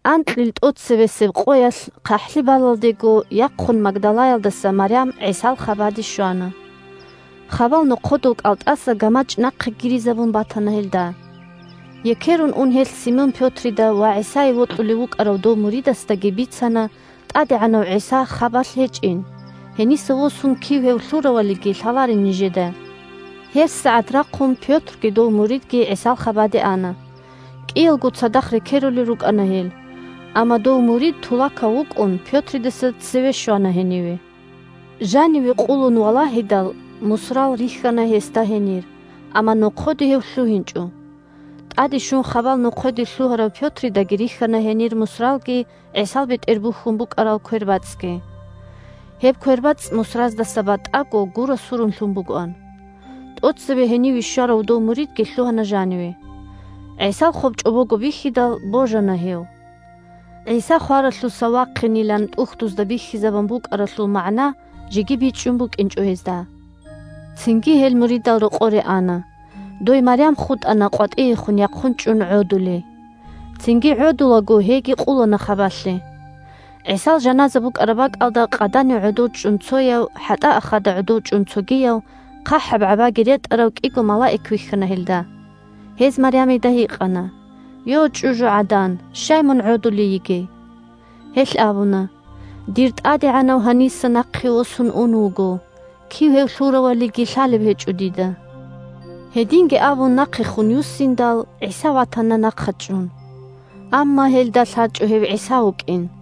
Анкьил тӀоцебесеб къоялъ хъахӀлъи балалдего яхъун Магдалаялдаса Марям ГӀисал хабаде щвана. Хабал нохъодул кӀалтӀаса гамачӀ нахъе гиризабун батана гьелда. Екерун ун гьелъ Симон Пётридаги ва ГӀисае вокьулев вукӀарав дов муридасдаги бицана ТӀадегӀанав ГӀиса хабалъ гьечӀин, гьениса восун кив гьев лъуравалиги лъаларин нижеда. ГьебсагӀат рахъун Пётрги дов муридги ГӀисал хабаде ана. КӀиялго цадахъ рекерулел рукӀана гьел, амма дов мурид тулакав вукӀун, Пётридаса цеве щвана гьениве. Жаниве къулун валагьидал, мусрал рихьана гьесда гьенир, амма нохъоде гьев лъугьинчӀо. ТӀаде щун хабал нохъоде лъугьарав Пётридаги рихьана гьенир мусралги ГӀисал бетӀер бухьун букӀараб квербацӀцӀги. Гьеб квербацӀцӀ мусраздаса батӀаго гура-сурун лъун бугоан. ТӀоцеве гьениве щварав дов муридги лъугьана жаниве. ГӀисал хоб чӀобого бихьидал, божана гьев. ГӀиса хваралъуса вахъинилан ТӀухьдузда бихьизабун букӀаралъул магӀна жеги бичӀчӀун букӀинчӀо гьезда. Цинги гьел муридал рокъоре ана. Дой Марям хутӀана къватӀиехун яхъун чӀун гӀодулей. Цинги гӀодулаго гьейги къулана хабалъе. ГӀисал жаназа букӀараб бакӀалда къаданив гӀодов чӀун цояв, хӀатӀаахада гӀодов чӀун цогияв – хъахӀаб гӀабаги ретӀарав кӀиго малаик вихьана гьелда. Гьез Марямида гьикъана: – Йо, чӀужугӀадан, щай мун гӀодулей йигей? Гьелъ абуна: – Дир ТӀадегӀанав гьаниса нахъе восун ун вуго, кив гьев лъуравалиги лъалеб гьечӀо дида. Гьединги абун нахъехун юссиндал, ГӀиса ватана нахъа чӀун. Амма гьелда лъачӀо гьев ГӀиса вукӀин.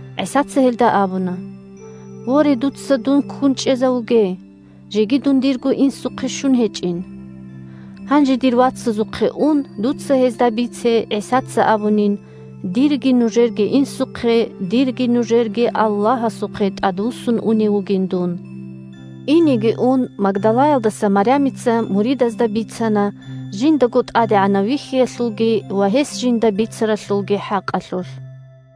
ГӀисаца гьелда абуна: – Воре, дуца дун ккун чӀезавуге, жеги дун дирго Инсухъе щун гьечӀин. Гьанже дир вацазухъе ун, дуца гьезда бице ГӀисаца абунин, дирги нужерги Инсухъе, дирги нужерги Аллагьасухъе тӀадвуссун унев вугин дун. Инеги ун Магдалаялдаса Марямица муридазда бицана жиндаго ТӀадегӀанав вихьиялъулги ва гьес жинда бицаралъулги хӀакъалъулъ.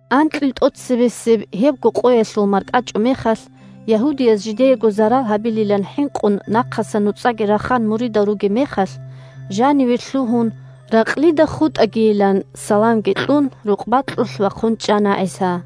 Анкьил тӀоцебесеб гьебго къоялъул маркӀачӀумехалъ ягьудияз жидеего зарал гьабилилан хӀинкъун, нахъасан нуцӀаги рахан муридал ругеб мехалъ, жаниве лъугьун, ракълида хутӀагийилан саламги кьун, рукъ бакьулъ вахъун чӀана ГӀиса.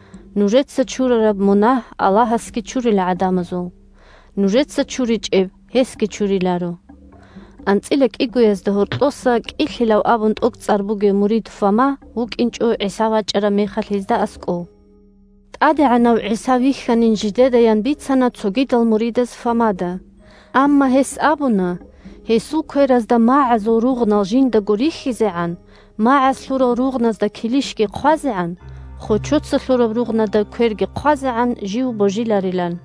Нужеца чурараб мунагь Аллагьасги чурила гӀадамазул. Нужеца чуричӀеб гьесги чуриларо. АнцӀила кӀигоязда гьоркьоса «КӀилъилав» абун тӀокӀцӀар бугев мурид Фома вукӀинчӀо ГӀиса вачӀараб мехалъ гьезда аскӀов. ТӀадегӀанав ГӀиса вихьанин жидедаян бицана цогидал муридаз Фомада. Амма гьес абуна, гьесул кверазда магӀазул ругънал жиндаго рихьизегӀан, магӀаз лъурал ругъназда килищги хъвазегӀан, хочоца лъураб ругънада кверги хъвазегӀан, жив божиларилан.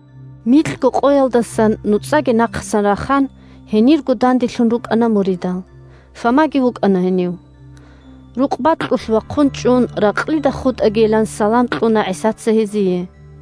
Микьго къоялдасан, нуцӀаги нахъасан рахан, гьенирго данделъун рукӀана муридал. Фомаги вукӀана гьенив. Рукъ бакьулъ вахъун чӀун, ракълида хутӀагийилан салам кьуна ГӀисаца гьезие.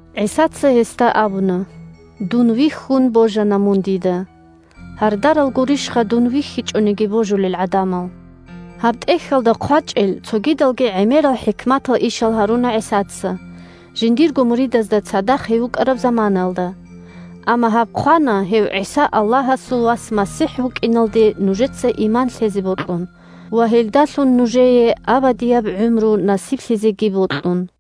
ГӀисаца гьесда абуна: – Дун вихьун, божана мун дида. Гьардарал гурищха дун вихьичӀониги божулел гӀадамал! Гьаб тӀехьалда хъвачӀел цогидалги гӀемерал хӀикматал ишал гьаруна ГӀисаца, жиндирго муридазда цадахъ гьев вукӀараб заманаялда. Амма гьаб хъвана гьев ГӀиса Аллагьасул Вас МасихӀ вукӀиналде нужеца иман лъезе бокьун ва гьелдалъун нужее абадияб гӀумру насиблъизеги бокьун.